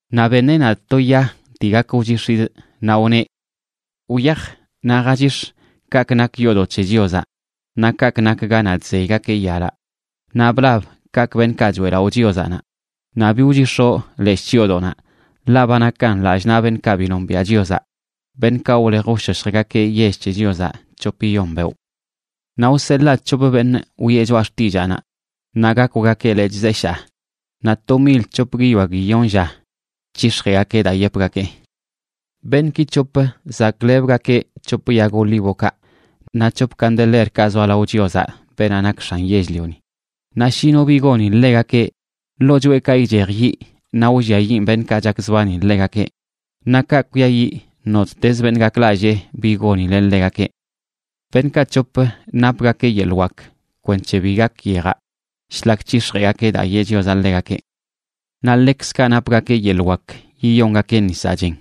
Naꞌ beṉeꞌ nadꞌ to ya dii gak wchix̱idꞌ, naꞌ wneꞌ: ―Wyaj naꞌ jachix̱ kaꞌkꞌ nak yoodoꞌ c̱he Chiozaꞌ naꞌ kaꞌkꞌ nak ganaꞌ chzeygakeꞌ yalaꞌ, naꞌ blab kaꞌkꞌ beṉꞌkaꞌ choeꞌlaꞌo Chiozaꞌ naꞌ. Naꞌ bi wchix̱oꞌ leshꞌ chyoodoꞌnaꞌ, ḻaꞌ ba nakan lallꞌ naꞌ beṉꞌkaꞌ bi nombiaꞌ Chiozaꞌ, beṉꞌkaꞌ wlej wshoshjgakeꞌ yell c̱he Chiozaꞌ c̱hopiyon beoꞌ. Naꞌ wseḻaa c̱hop beṉꞌ wiꞌe choꞌa xtillaanaꞌ, naꞌ gakwgakeꞌ lechꞌ zeshaa, naꞌ to mil c̱hop guiyoa guiyon lla c̱hix̱jeꞌgakeꞌ daa yepgakee. Beṉꞌki c̱hop zaklebgakeꞌ c̱hop yag olívokaꞌ naꞌ c̱hop candelerkaꞌ zoa lao Chiozaꞌ, beenaꞌ nak X̱an yell-lioni. Naꞌ shi no bi goni ḻegakeꞌ, ḻoo choꞌekaꞌ ichej yiꞌ naꞌ wlliayiꞌn beṉꞌkaꞌ chakzbani ḻegakeꞌ. Naꞌ kaꞌ kwiayiꞌ nottezə beṉꞌ gaklallee bi gonileꞌ ḻegakeꞌ. Beṉꞌkaꞌ c̱hop napgakeꞌ yeḻꞌ wak kwenc̱he bi gak yejaꞌ shlak c̱hix̱jeꞌgakeꞌ daa yeꞌ Chiozaꞌ ḻegakeꞌ. Naꞌ ḻekzkaꞌ napgakeꞌ yeḻꞌ wak yiyongakeꞌ nisaꞌ chen,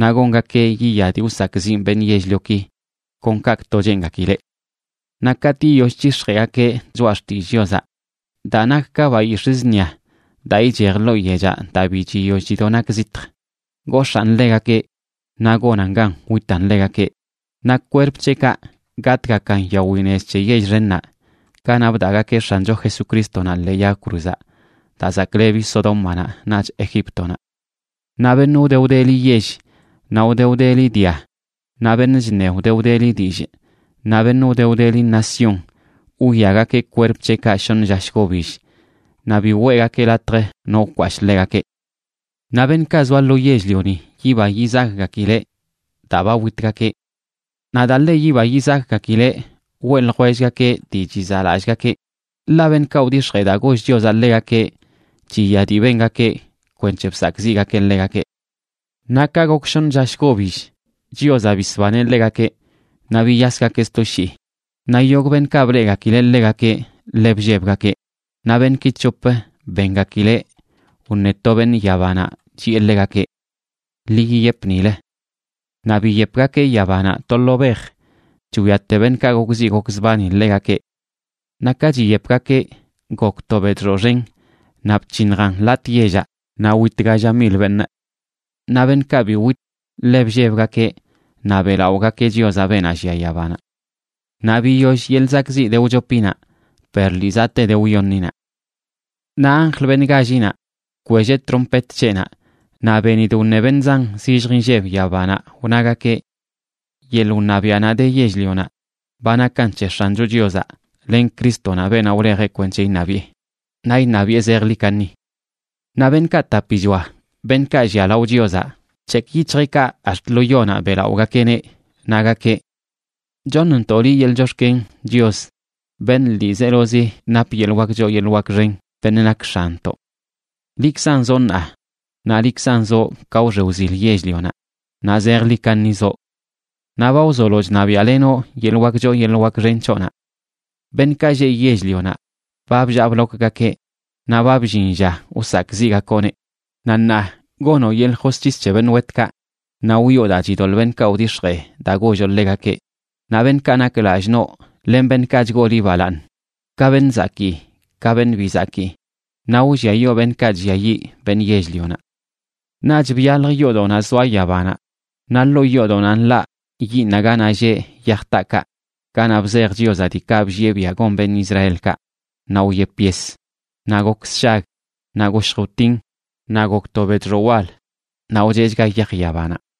naꞌ gongakeꞌ yiya dii wsakꞌziꞌn beṉꞌ yell-lioki kon kaꞌkꞌto cheengakileꞌ. Naꞌ katꞌ yiyoll c̱hix̱jeꞌgakeꞌ choꞌa xtillꞌ Chiozaꞌ, daa nak ka bayix̱ꞌ zṉia daa ichej ḻoo yechaꞌ daa bi chiyoll chido nak zitj, gox̱aan ḻegakeꞌ naꞌ gonan gan witan ḻegakeꞌ. Naꞌ kwerp c̱heꞌkaꞌ gatꞌgakan yawi nez c̱he yell xennaꞌ ganaꞌ bdaꞌgakeꞌ X̱ancho Jesucrístonaꞌ ḻee yag cruzaꞌ, daa zaklebi Sodómanaꞌ naꞌch Egíptonaꞌ. Naꞌ beṉꞌ wde wdeli yell, naꞌ wde wdeli dia, naꞌ beṉꞌ chṉe wde wdeli dillꞌ, naꞌ beṉꞌ wde wdeli nación wwiagakeꞌ kwerp c̱heꞌkaꞌ shoṉ lla shgobill, naꞌ bi weꞌgakeꞌ latj no wkwashꞌ ḻegakeꞌ. Naꞌ beṉꞌkaꞌ zoa lo yell-lioni yiba yizakgakileꞌ daa ba witgakeꞌ. Naꞌ daa ḻe yiba yizakgakileꞌ weꞌ ljwellgakeꞌ dii chizaꞌlallꞌgakeꞌ, ḻaꞌ beṉꞌkaꞌ wdix̱jee daa goll Chiozaꞌ ḻegakeꞌ chiya dii bengakeꞌ kwenc̱he bsakꞌziꞌgakeꞌ ḻegakeꞌ. Naꞌ ka gok shoṉ lla shgobill, Chiozaꞌ bisbaneꞌ ḻegakeꞌ, naꞌ biyasgakeꞌ sto shii. Naꞌ yogꞌ beṉꞌkaꞌ bleꞌgakileꞌ ḻegakeꞌ ḻe bllebgakeꞌ. Naꞌ beṉꞌki c̱hop bengakileꞌ wṉe to beṉꞌ yabanaꞌ, chiꞌe ḻegakeꞌ: ―Ḻi yiyep nilə. Naꞌ biyepgakeꞌ yabanaꞌ to lo bej, chwiate beṉꞌkaꞌ gokziꞌ gokzbani ḻegakeꞌ. Naꞌ ka chiyepgakeꞌ gok to bedxoꞌ xen, naꞌ bc̱hiṉjan latꞌa yellaꞌ, naꞌ wit galla mil beṉꞌ. Naꞌ beṉꞌkaꞌ bi wit ḻe bllebgakeꞌ naꞌ beꞌlaꞌogakeꞌ Chiozaꞌ, beenaꞌ llia yabanaꞌ. Naꞌ biyoll yeḻꞌ zakꞌziꞌ de wchopinaꞌ, per lii zaꞌte de wyoṉinaꞌ. Naꞌ anjl, beṉꞌ gállinaꞌ, bkwelleꞌ trompet c̱heꞌnaꞌ, naꞌ benidꞌ wṉe beṉꞌ zan zillj inlleb yabanaꞌ, wnagakeꞌ: Yeḻꞌ wṉabiaꞌnaꞌ de yell-lionaꞌ ba nakan c̱he X̱ancho Chiozaꞌ len Crístonaꞌ, beenaꞌ wlejeꞌ kwenc̱he iṉabiꞌe; naꞌ iṉabiꞌe zejḻi kaṉi. Naꞌ beṉꞌkaꞌ tapichoa, beṉꞌkaꞌ llia lao Chiozaꞌ, bc̱hekꞌ yic̱hjeꞌkaꞌ ax̱t lo yonaꞌ, beꞌlaꞌogakeꞌneꞌ, nagakeꞌ: Choṉntoꞌ liꞌ yeḻꞌ chox̱ken, Chios, beṉꞌ ḻiizelozi nap yeḻꞌ wak choo yeḻꞌ wak xen, beṉꞌ nak X̱anntoꞌ. Liꞌkzan zoꞌ ṉaa, naꞌ liꞌkzan zoꞌ ka wxe wzil yell-lionaꞌ, naꞌ zejḻi kaṉi zoꞌ. Naꞌ ba wzolo chṉabiaꞌlenoꞌ yeḻꞌ wak choo yeḻꞌ wak xen c̱hoꞌnaꞌ. Beṉꞌkaꞌ lleꞌ yell-lionaꞌ ba bllaa blokgakeꞌ, naꞌ ba bllin lla wsakꞌziꞌgakoꞌneꞌ. Naꞌ ṉaa gonoꞌ yeḻꞌ josc̱his c̱he beṉꞌ wetkaꞌ, naꞌ wiꞌo daa chidoḻꞌ beṉꞌkaꞌ wdix̱jee daa golloꞌ ḻegakeꞌ, naꞌ beṉꞌkaꞌ nak lallꞌ noꞌ, len beṉꞌkaꞌ chgoo liꞌ balaaṉ, ka beṉꞌ zakii ka beṉꞌ bi zakii; naꞌ wlliayoo beṉꞌkaꞌ chlliayiꞌ beṉꞌ yell-lionaꞌ. Naꞌch byalj yoodoꞌnaꞌ zoa yabanaꞌ, naꞌ ḻoo yoodoꞌnaꞌ nḻaꞌ yiiṉaꞌ ganaꞌ lleꞌ yaj taakaꞌ ganaꞌ bzej Chiozaꞌ diikaꞌ bllieꞌ biaꞌ gon beṉꞌ Israelkaꞌ. Naꞌ wyep yes, naꞌ gok sshag, naꞌ goshj wtin, naꞌ gok to bedxoꞌ wal, naꞌ wcheꞌchga yaj yabanaꞌ.